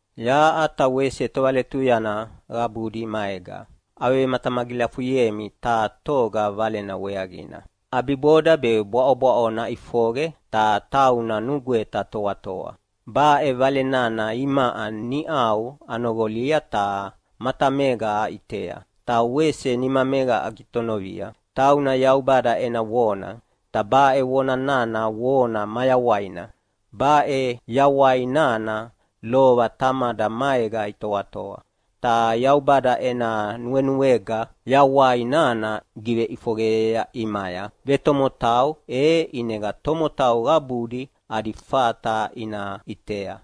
Yaʼa ta wese tovaletuyana qabudi maega avevematamagilafuyemi taha toga Valena weaqina. ʼAbiboda be bwaʼobwaʼo naʼifoqe, ta tauna nugweta toatoa. Baʼe Vale nana imaʼa niʼau anoqolia ta matamega aʼitea, ta wese nimamega agitonovia. Tauna Yaubada ena Vona, ta baʼe Vona nana Vona mayawaina. Baʼe Yawai nana lova Tamada maega itoatoa, ta Yaubada ena nuenuega Yawai nana giveʼifoqeyea ʼimaya vetomotau e ʼinega tomotau qabudi adi fata ina ʼitea.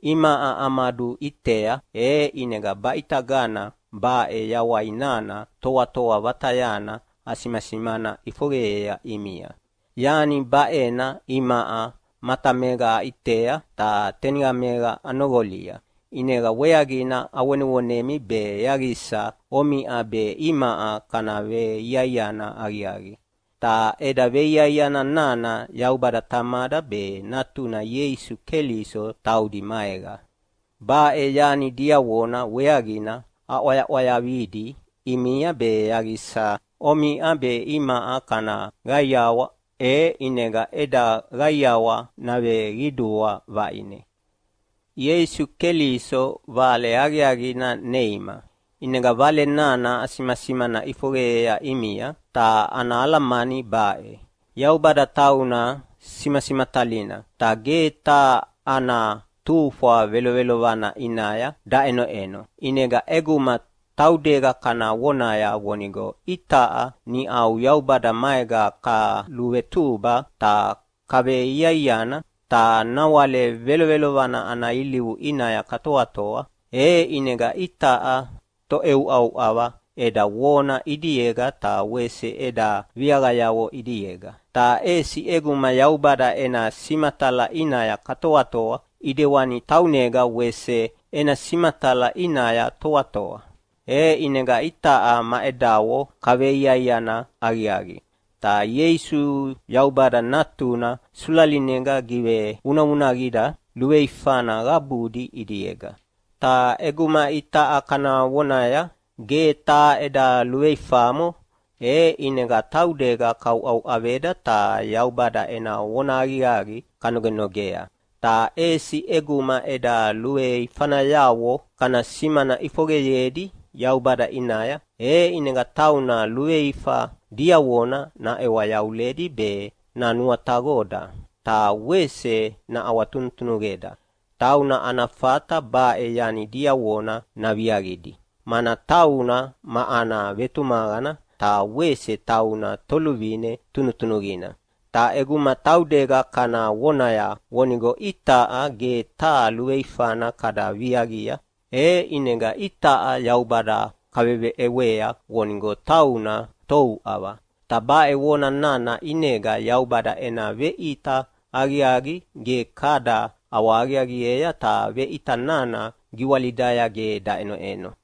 Imaʼa amaduʼitea e ʼinega baʼitagana baʼe Yawai nana toatoa vatayana asimasimana ʼifoqeyea ʼimia. Yani baʼena imaʼa matamega aʼitea ta teniqamega anoqolia, ʼinega weaqina avonevonemi be yaqisa omiʼa be imaʼa kana veiaiana aqiaqi. Ta eda veiaiana nana Yaubada Tamada be Natuna Ieisu Keliso taudi maega. Baʼe yani diavona weaqina aʼwayaʼwayavidi ʼimia be yaqisa omiʼa be imaʼa kana qaiawa, e ʼinega eda qaiawa naveqidua vaʼine. Ieisu Keliso Vale Aqiaqina neima, ʼinega Vale nana asimasimana ʼifoqeyea ʼimia, ta ana alamani baʼe: Yaubada tauna simasimatalina, ta ge taha ana tufwa velovelovana ʼinaya daʼenoʼeno. ʼInega ʼeguma taudega kana vonaya vonigo itaʼa niʼau Yaubada maega kaluvetuba ta kaveveiaiana, ta nawale velovelovana ana ilivu ʼinaya katoatoa, e ʼinega itaʼa toʼeuʼauʼava eda vona ʼidiega ta wese eda viaqayavo ʼidiega. Ta ʼesi ʼeguma Yaubada ena simatala ʼinaya katoatoa ʼidewani taunega wese ena simatala ʼinaya toatoa, e ʼinega itaʼa ma edavo kaveveiaiana aqiaqi. Ta Ieisu Yaubada Natuna sulalinega givevunavunaqida luveifana qabudi ʼidiega. Ta ʼeguma itaʼa kana vonaya, “Ge taha eda luveifamo”, e ʼinega taudega kauʼauʼaveda ta Yaubada ena vonahaqiaqi kanogenogea. Ta ʼesi ʼeguma eda luveifanayavo kana simana ʼifoqeyedi Yaubada ʼinaya, e ʼinega tauna luveifa diavona naʼewa yavuledi be nanuataqoda, ta wese naʼawatunutunuqeda. Tauna ana fata baʼe yani diavona naviaqidi, mana tauna ma ana vetumaqana ta wese tauna Toluvine tunutunuqina. Ta ʼeguma taudega kana vonaya vonigo itaʼa ge taha luveifana kada viaqia, e ʼinega itaʼa Yaubada kaveʼewea vonigo tauna touʼava. Ta baʼe vona nana ʼinega Yaubada ena veʼita aqiaqi ge kada ʼawahaqiaqiea ta veʼita nana giwalidaya ge daʼenoʼeno.